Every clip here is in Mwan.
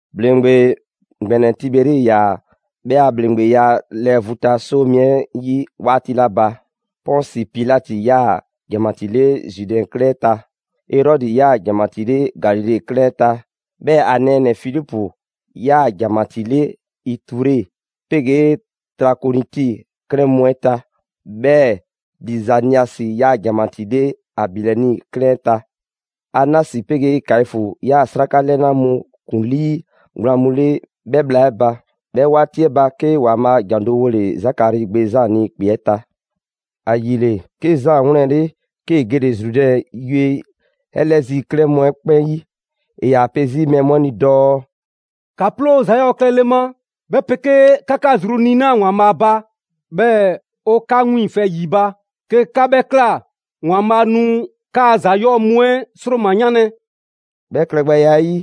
‑Bhleŋgbe ‑gbɛnɛ Tiberi ‑yaa' 'bhɛ a ‑bhleŋgbeya lɛɛ vu ta 'soo mi 'ɛ 'yi 'waati 'la ba, Pɔnsi Pilati ‑yaa ‑janmatii 'le Zude 'klɛɛn 'ɛ ta. Erɔdi ‑yaa ‑janmatii 'le Galile 'klɛɛn 'ɛ ta, 'bhɛɛ‑ ‑a nɛɛnɛ‑ Filipu ‑yaa ‑janmatii 'le Iture 'pegee Trakoniti 'klɛɛn mu 'ɛ ta. 'Bhɛɛ‑ Lizaniasi ‑yaa ‑janmatii 'le Abilɛni 'klɛɛn 'ɛ ta. Anasi 'pegee Kaifu ‑yaa 'sraka 'lɛna mu ‑kuŋlii gblaan mu 'le 'bhɛ bhla 'ɛ ba. 'Bhɛ 'waati 'ɛ ba, 'ke ‑Waanbhaa' ‑jan do wole‑ Zakari gbe Zaan ni ‑kpe 'ɛ ta. ‑Ayile, 'ke Zaan 'wlɛnle, 'kee‑ gele‑ Zrudɛn yue 'ɛ 'lɛ zi 'klɛɛn mu 'ɛ 'kpɛn 'yi. ‑E ‑yaa pe 'zi mɛɛ mu 'ɛ ni dɔɔ: «‑Ka ploo ‑za 'yɔɔ‑ klɛle ma, 'bhɛ 'pegee ‑ka 'ka zru niina‑ ‑Waanbhaa ba, 'bhɛɛ‑ ‑o ‑ka 'ka 'wiiŋfɛ ‑yi ba. 'Ke 'ka 'bhɛ ꞊kla, ‑Waanbhaa' nu 'kaa‑ ‑za 'yɔɔ‑ mu 'ɛ ‑sroma 'yanlɛ‑.» 'Bhɛ klɛgbɛya 'ɛ 'yi,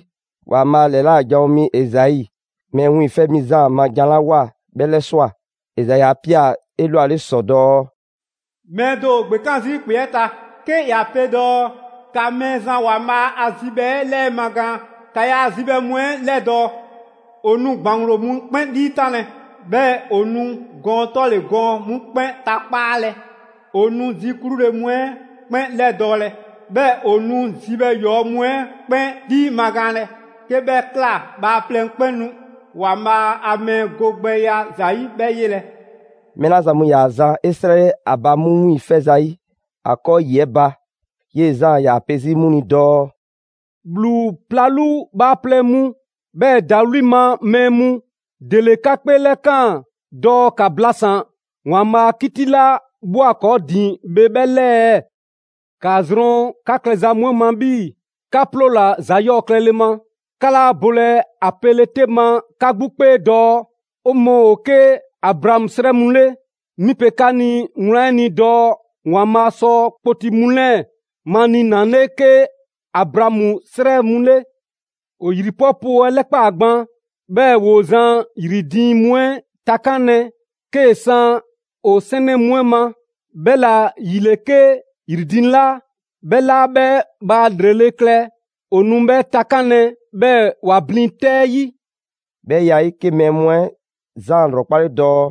‑Waanbhaa' ‑lɛla' janwo mi Ezai Mɛɛ Wiiŋfɛ' Mi Zaan ma jan 'la ꞊woa 'bhɛ 'lɛswa꞊. Ezai 'a ꞊pia‑ 'elwale ‑sɔ dɔɔ: «Mɛɛ do ‑o ‑gbekan' zii' ‑kpe 'ɛ ta, 'ke ‑ya pe dɔɔ: ‑Ka Mɛɛzan ‑Waanbhaa' a zibhɛ 'ɛ 'lɛmagaan, ‑ka ‑yaa' zibhɛ mu 'ɛ 'lɛdɔɔ‑. ‑O nu ‑gbaŋglo mu 'kpɛn 'liitanlɛ. 'Bhɛɛ‑ ‑o nu gɔɔn 'tɔle‑ gɔɔn 'mu 'kpɛn takpaalɛ. ‑O nu zi 'klule‑ mu 'ɛ 'kpɛn 'lɛdɔɔlɛ; 'bhɛɛ ‑o nu zibhɛ ‑yɔɔ' mu 'ɛ 'kpɛn 'liimagaanlɛ. 'Ke 'bhɛ ꞊kla, bhaaplɛŋ 'kpɛn nu ‑Waanbhaa' a mɛɛ go gbɛya ‑za 'yi 'bhɛ 'yelɛ‑.» Mɛɛ 'la zan mu ‑yaa zan 'esrɛle ‑a ba 'mu 'wiiŋfɛ ‑zayi' ‑a 'kɔɔ ‑yi 'ɛ ba, 'yee‑ Zaan ‑yaa pe 'zi 'mu ni dɔɔ: «‑Bhlu 'plalu bhaaplɛŋ mu, 'bhɛɛ‑ ‑dawli' ma mɛɛ mu, ‑dele 'ka 'kpeelɛkaan dɔɔ 'ka 'blasan‑ ‑Waanbhaa' a 'kiti 'la ꞊bhwa ‑kɔɔ' ‑din bhe 'bhɛ 'lɛɛ ɛɛ? ‑Kaa zrɔn 'ka klɛza mu 'ɛ ma 'bhii‑ 'ka 'ploola‑ ‑za 'yɔɔ‑ klɛle ma. 'Ka 'laa bolɛ ‑a 'pele‑ 'te ma 'ka 'gbu 'kpee dɔɔ: ‹'O mɔɔ ‑o 'ke Abraamu 'srɛ mu 'le.› 'Mi pe 'ka ni wlan 'ɛ ni dɔɔ ‑Waanbhaa' sɔ kpoti mu 'lɛɛ‑ maniinale 'ke Abraamu 'srɛ mu 'le! ‑O ‑yri 'pɔ poo 'ɛ 'lɛkpaa꞊ gban, 'bhɛɛ‑ ‑woo zan ‑yri diiŋ mu 'ɛ takanlɛ 'kee‑ san ‑o 'sɛnɛ mu 'ɛ ma. 'Bhɛla‑ ‑yile 'ke ‑yri diiŋ 'la 'bhɛ 'laa 'bhɛ bhaa ‑lrele' klɛ, ‑o nu 'bhɛ takanlɛ 'bhɛɛ‑ ‑wa blin 'tɛ 'yi.» 'Bhɛ ya 'ɛ 'yi, 'ke mɛɛ mu 'ɛ Zaan ‑lrɔkpale dɔɔ: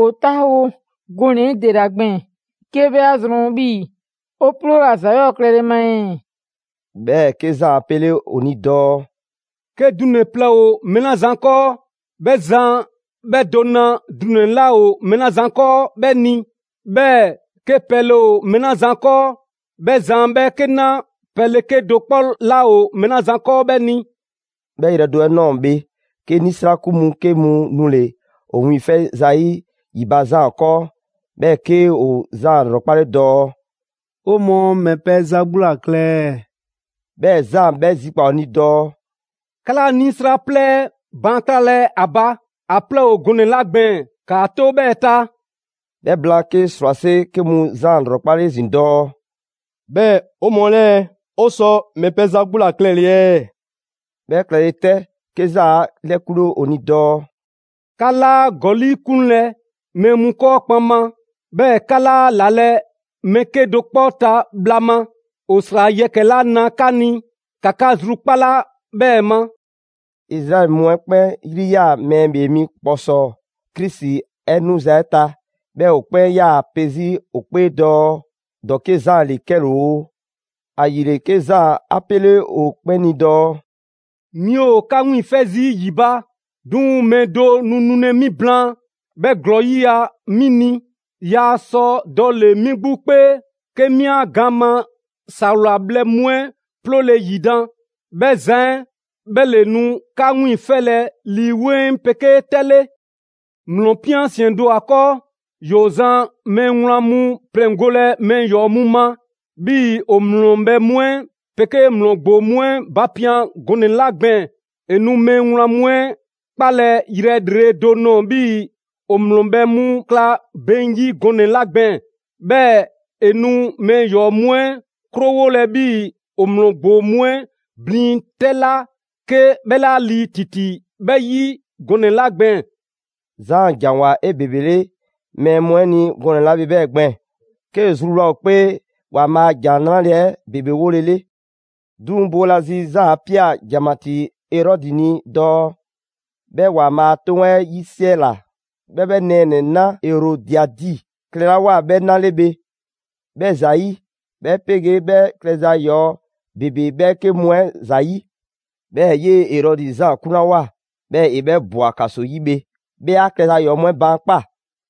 «'O 'taawo‑ gɔnɛ‑ 'ɛ ‑dela gbɛɛn‑ 'ke 'bhɛ 'a zrɔn 'bhii‑ 'o 'ploola‑ ‑za 'yɔɔ‑ klɛle ma ɛɛ?» 'Bhɛɛ‑ 'ke Zaan 'a 'pele ‑o ni dɔɔ: «'Ke dunɛ‑ plɛ ‑o mɛɛ 'la zan 'kɔɔ, 'bhɛ zan 'bhɛ do na ‑dunɛ 'laa ‑o mɛɛ 'la zan 'kɔɔ 'bhɛ ni. 'Bhɛɛ‑ 'ke pɛle ‑o mɛɛ 'la zan 'kɔɔ 'bhɛ zan 'bhɛ 'ke 'na pɛle 'kedo‑ 'kpɔ 'laa ‑o mɛɛ 'la zan 'kɔɔ 'bhɛ ni.» 'Bhɛ yrɛ do 'ɛ ꞊nɔɔ bhe, 'ke 'nisrakun mu 'ke mu nule‑ ‑o wiiŋfɛ' ‑zayi' ‑yi ba Zaan 'kɔɔ, 'bhɛɛ‑ 'ke ‑o Zaan 'lrɔkpale dɔɔ: «'O mɔɔ ‑mɛ pɛ za 'gbu ‑la klɛ ɛɛ?» 'Bhɛɛ‑, Zaan 'bhɛ zikpaa‑ ‑o ni dɔɔ: «'Ka 'laa 'nisra 'plɛɛ 'ɛ baan' 'klalɛ‑ ‑a ba. ‑A 'plɛɛ ‑o gɔnɛ‑ 'la gbɛɛn‑ ‑kaa 'to 'bhɛɛ‑ ta.» 'Bhɛ blaan, 'ke 'srwase 'ke mu Zaan 'lrɔkpale 'ezin‑ dɔɔ: «'Bhɛɛ‑ 'o mɔɔ 'lɛɛ‑, 'o sɔ ‑mɛ pɛ za 'gbu ‑la klɛle‑ ɛɛ?» 'Bhɛ klɛle 'tɛ, 'ke Zaan 'a 'lɛkunle ‑o ni dɔɔ: «'Ka 'laa ‑gɔli' 'kunlɛ‑ mɛɛ mu 'kɔɔ kpaŋma, 'bhɛɛ‑ 'ka 'laa 'lalɛ‑ mɛɛ 'kedo‑ 'kpɔ ta bhla ma. ‑O ‑sra yɛkɛ‑ 'la na 'ka ni ‑ka 'ka zrukpala 'bhɛɛ‑ ma.» Izraɛli mu 'ɛ 'kpɛn 'yri 'yaa‑ Mɛɛ ‑Bhee Mi ‑kpɔsɔɔ Krisi 'ɛ 'nuza‑ 'ɛ ta. 'Bhɛɛ‑ ‑o 'kpɛn 'yaa‑ ‑a pe zi ‑o 'kpee dɔɔ ‑dɔke' Zaan ‑le 'kɛle‑ ‑o. ‑Ayile, 'ke Zaan 'a 'pele ‑o 'kpɛn ni dɔɔ: «'Mi ‑o 'ka 'wiiŋfɛ zii' ‑yi ba, 'duŋ‑ mɛɛ do nu nulɛ 'mi blaan, 'bhɛ ‑glɔɔ 'yiya‑ 'mi ni. Yaa sɔ dɔle‑ 'mi 'gbu 'kpee 'ke 'mi 'a gaan ma ‑sawla bhlɛ mu 'ɛ 'ploole‑ ‑yidan'. 'Bhɛ zan 'ɛ 'bhɛ ‑le nu 'ka 'wiiŋfɛlɛ Lii 'Weŋ 'pegee 'tɛ 'le. ‑Mlɔ ꞊pian ‑siɛn do ‑o ‑a 'kɔɔ, ‑yoo zan mɛɛ wlan mu pleŋgolɛ mɛɛ ‑yɔɔ' mu ma, 'bhii‑ ‑o ‑mlɔ bhɛ mu 'ɛ 'pegee ‑mlɔ ‑gboo mu 'ɛ bapian gɔnɛ‑ 'la gbɛɛn‑. ‑E nu mɛɛ wlan mu 'ɛ 'kpalɛ‑ yrɛ ‑lrele' do nɔɔ‑ 'bhii‑ ‑o ‑mlɔ bhɛ mu 'kla beŋ 'yi gɔnɛ‑ 'la gbɛɛn‑. 'Bhɛɛ‑ ‑e nu mɛɛ ‑yɔɔ' mu 'ɛ 'krowolɛ 'bhii‑ ‑o ‑mlɔ ‑gboo mu 'ɛ blin 'tɛ 'la 'ke 'bhɛ 'laa lii ‑titi 'bhɛ 'yi gɔnɛ‑ 'la gbɛɛn‑.» Zaan ‑janwoa 'ebebele mɛɛ mu 'ɛ ni gɔnɛ‑ 'la bhe 'bhɛɛ‑ gbɛɛn‑ 'kee‑ zruwla ‑o 'kpee ‑Waanbhaa' a ‑Jan 'Nrale‑ 'ɛ ‑bebe 'wolele. 'Duŋ‑ boolazi, Zaan 'a ꞊pia ‑janmatii Erɔdi ni dɔɔ 'bhɛ ‑Waanbhaa' a 'toŋ 'ɛ 'yisiɛla 'bhɛ 'bhɛ nɛɛnɛ‑ 'na Erodiadi klɛlawoa 'bhɛ 'na 'le bhe 'bhɛ ‑zayi'; 'bhɛ 'pegee 'bhɛ klɛza ‑yɔɔ ‑bebe 'bhɛɛke mu 'ɛ ‑zayi'. 'Bhɛɛ‑ 'yee‑ Erɔdi Zaan 'kunlawoa, 'bhɛɛ‑ ‑e 'bhɛ ꞊bwa ‑kaso 'yi bhe, 'bhɛ 'a klɛza ‑yɔɔ' mu 'ɛ baankpaa꞊.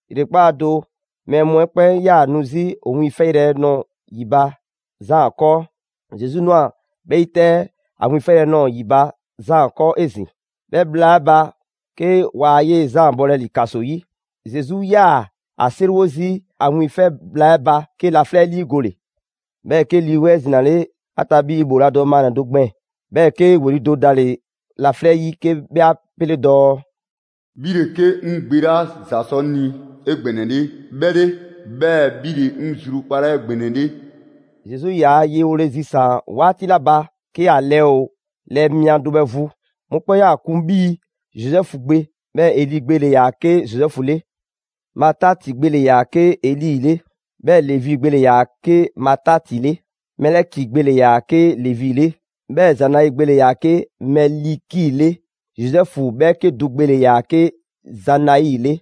‑Yrekpaa' do, mɛɛ mu 'ɛ 'kpɛn 'yaa‑ nu 'zi ‑o wiiŋfɛyrɛ nɔɔ‑ ‑yi ba Zaan 'kɔɔ. Zesu ꞊nwa 'bhɛɛ‑ 'yi 'tɛ ‑a wiiŋfɛyrɛ ꞊nɔɔ ‑yi ba Zaan 'kɔɔ 'ezin‑. 'Bhɛ bhla 'ɛ ba 'ke waa 'yee‑ Zaan bɔlɛ ‑li ‑kaso 'yi. Zesu 'yaa‑ ‑a 'seriwo zii' ‑a 'wiiŋfɛ bhla 'ɛ ba, 'ke laflɛ' 'liigole. 'Bhɛɛ‑, 'ke Lii 'Weŋ 'ɛ zinale ‑a ta 'bhii‑ ‑bhooladɔ maannɛ‑ do gbɛɛn‑. 'Bhɛɛ‑ 'ke ‑weli' do dale‑ laflɛ' 'yi 'ke 'bhɛ 'a 'pele dɔɔ: «'Bhi ‑le 'ke 'ŋ Gbe 'la ‑za sɔ 'ŋ ni 'egbɛnɛle 'bhɛ 'le, 'bhɛɛ‑ 'bhi ‑le 'ŋ zrukpalaa 'egbɛnɛle.» Zesu ‑yaa' ye 'ɛ 'wole‑ zisaan‑ 'waati 'la ba 'ke ‑a lɛɛ ‑o lɛɛ mia do bhɛ vu. Mɔkpɛn' 'yaa‑ kun 'bhii‑ Zozɛfu gbe. 'Bhɛɛ‑ Eli gbe ‑le ‑yaa 'ke Zozɛfu 'le. Mataati gbe ‑le ‑yaa 'ke Eli 'le, 'bhɛɛ‑ Levi gbe ‑le ‑yaa 'ke Mataati 'le. Mɛliki gbe ‑le ‑yaa 'ke Levi 'le; 'bhɛɛ‑ Zanai gbe ‑le ‑yaa 'ke Mɛliki 'le, Zozɛfu 'bhɛɛke do gbe ‑le ‑yaa 'ke Zanai 'le.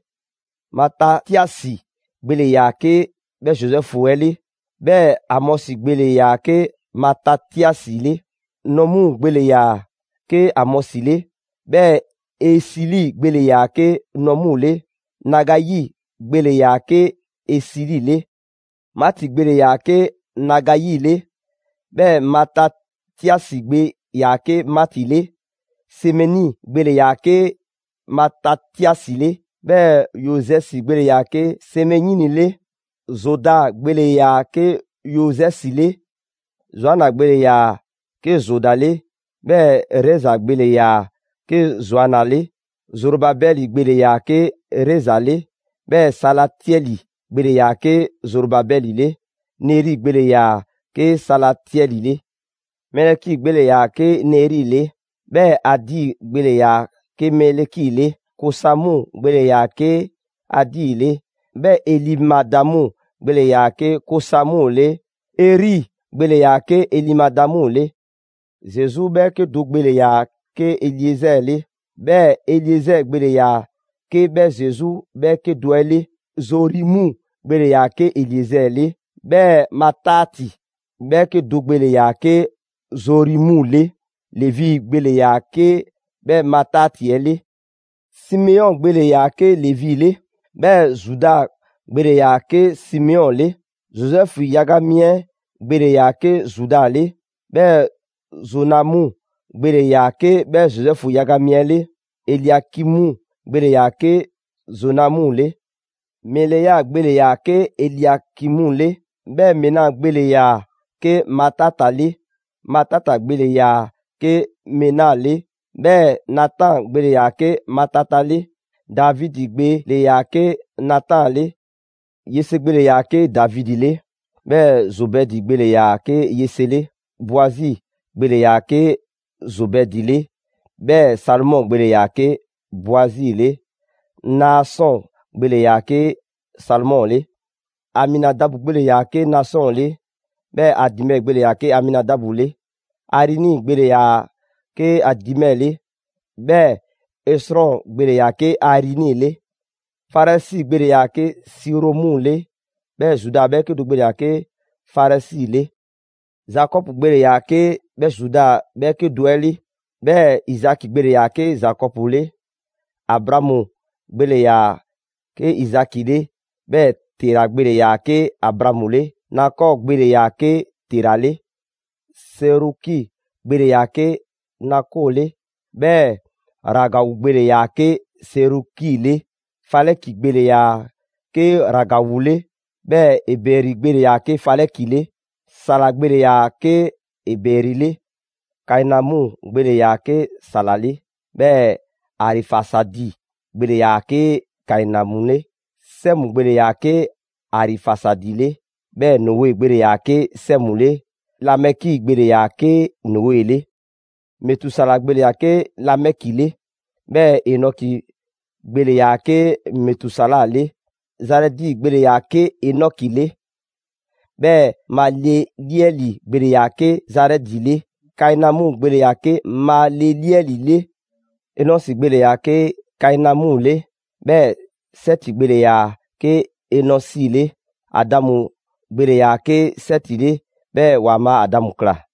Matatiasi gbe ‑le ‑yaa 'ke 'bhɛ Zozɛfu 'ɛ 'le; 'bhɛɛ‑ Amɔsi gbe ‑le ‑yaa 'ke Matatiasi 'le. Naumu gbe ‑le ‑yaa 'ke Amɔsi 'le; 'bhɛɛ‑ Esili gbe ‑le ‑yaa 'ke Naumu 'le. Nagayi gbe ‑le ‑yaa 'ke ‑Esili 'le. Maati gbe ‑le ‑yaa 'ke Nagayi 'le; 'bhɛɛ‑ Matatiasi gbe ‑yaa 'ke Maati 'le. Semeini gbe ‑le ‑yaa 'ke Matatiasi 'le; 'bhɛɛ‑ Yozɛsi gbe ‑le ‑yaa 'ke Semeini 'le. Zoda gbe‑le ‑yaa 'ke Yozɛsi 'le. Zoana gbe ‑le ‑yaa 'ke Zoda 'le; 'bhɛɛ‑ Reza gbe ‑le ‑yaa 'ke Zoana 'le. Zorobabɛli gbe ‑le ‑yaa 'ke Reza 'le; 'bhɛɛ‑ Salatiɛli gbe ‑le ‑yaa 'ke Zorobabɛli 'le. Neri gbe ‑le ‑yaa 'ke Salatiɛli 'le. Mɛliki gbe ‑le ‑yaa 'ke Neri 'le; 'bhɛɛ‑ Adi gbe ‑le ‑yaa 'ke Mɛliki 'le. Kosamu gbe ‑le ‑yaa 'ke Adi 'le; 'bhɛɛ‑ Elimadamu gbe ‑le ‑yaa 'ke Kosamu 'le. Eri gbe ‑le ‑yaa 'ke Elimadamu 'le. Zesu 'bhɛɛke do gbe ‑le ‑yaa 'ke Eliezɛɛ 'le; 'bhɛɛ‑ Eliezɛɛ gbe ‑le ‑yaa 'ke 'bhɛ Zesu 'bhɛɛke do 'ɛ 'le. Zorimu gbe ‑le ‑yaa 'ke Eliezɛɛ 'le; 'bhɛɛ‑ Mataati 'bhɛɛke do gbe ‑le ‑yaa 'ke Zorimu le. Levi gbe ‑le ‑yaa 'ke 'bhɛ Mataati 'ɛ 'le. Simeɔn gbe ‑le ‑yaa 'ke Levi 'le; 'bhɛɛ‑ Zuda gbe ‑le ‑yaa 'ke Simeɔn 'le. Zozɛfu yaga mi 'ɛ gbe ‑le ‑yaa 'ke Zuda 'le; 'bhɛɛ‑ Zonamu gbe ‑le ‑yaa 'ke 'bhɛ Zozɛfu yaga mi 'ɛ 'le. Eliakimu gbe ‑le ‑yaa 'ke Zonamu 'le. Melea gbe ‑le ‑yaa 'ke Eliakimu 'le; 'bhɛɛ‑ Mena gbe ‑le ‑yaa 'ke Matata 'le. Matata gbe ‑le ‑yaa 'ke Mena 'le; 'bhɛɛ‑ Natan gbe ‑le ‑yaa 'ke Matata 'le. Davidi gbe ‑le ‑yaa 'ke Natan 'le. Yese gbe ‑le ‑yaa 'ke Davidi 'le; 'bhɛɛ‑ Zobɛdi gbe ‑le ‑yaa 'ke Yese 'le. Boazi gbe ‑le ‑yaa 'ke Zobɛdi 'le; 'bhɛɛ‑ Salomɔ gbe ‑le ‑yaa 'ke Boazi 'le. Naasɔn gbe ‑le ‑yaa 'ke Salomɔ 'le. Aminadabu gbe ‑le ‑yaa 'ke Naasɔn 'le; 'bhɛɛ‑ Adimɛ gbe ‑le ‑yaa 'ke Aminadabu 'le. Arini gbe ‑le ‑yaa 'ke Adimɛ 'le; 'bhɛɛ‑ Esrɔn gbe ‑le ‑yaa 'ke Arini 'le. Farɛsi gbe ‑le ‑yaa 'ke Siromu 'le; 'bhɛɛ‑ Zuda 'bhɛɛke do gbe ‑le ‑yaa 'ke Farɛsi 'le. Zakɔbu gbe ‑le ‑yaa 'ke 'bhɛ Zuda 'bhɛɛke do 'ɛ 'le; 'bhɛɛ‑ Izaki gbe ‑le ‑yaa 'ke Zakɔbu 'le. Abraamu gbe ‑le ‑yaa 'ke Izaki 'le; 'bhɛɛ‑ Tera gbe ‑le ‑yaa 'ke Abraamu 'le. Nakɔɔ gbe ‑le ‑yaa 'ke Tera 'le. Seruki gbe ‑le ‑yaa 'ke Nakɔɔ 'le; 'bhɛɛ‑ Ragawu gbe ‑le ‑yaa 'ke Seruki 'le. Falɛki gbe ‑le ‑yaa 'ke Ragawu 'le; 'bhɛɛ‑ Ebɛri gbe ‑le ‑yaa 'ke Falɛki 'le. Sala gbe ‑le ‑yaa 'ke Ebɛri 'le. Kainamu gbe ‑le ‑yaa 'ke Sala 'le; 'bhɛɛ‑ Arifasadi gbe ‑le ‑yaa 'ke Kainamu 'le. Sɛmu gbe ‑le ‑yaa 'ke Arifasadi 'le; 'bhɛɛ‑ Noe gbe ‑le ‑yaa 'ke Sɛmu 'le. Lamɛki gbe ‑le ‑yaa 'ke Noe 'le. Metusala gbe ‑le ‑yaa 'ke Lamɛki 'le; 'bhɛɛ‑ Enɔki gbe ‑le ‑yaa 'ke Metusala 'le. Zarɛdi gbe ‑le ‑yaa 'ke Enɔki 'le; 'bhɛɛ‑ Maleliɛli gbe ‑le ‑yaa 'ke Zarɛdi 'le. Kainamu gbe ‑le ‑yaa 'ke Maleliɛli 'le. Enɔsi gbe ‑le ‑yaa 'ke Kainamu 'le; 'bhɛɛ‑ Sɛti gbe ‑le ‑yaa 'ke Enɔsi 'le. Adamu gbe ‑le ‑yaa 'ke Sɛti 'le; 'bhɛɛ‑ ‑Waanbhaa' Adamu ꞊kla.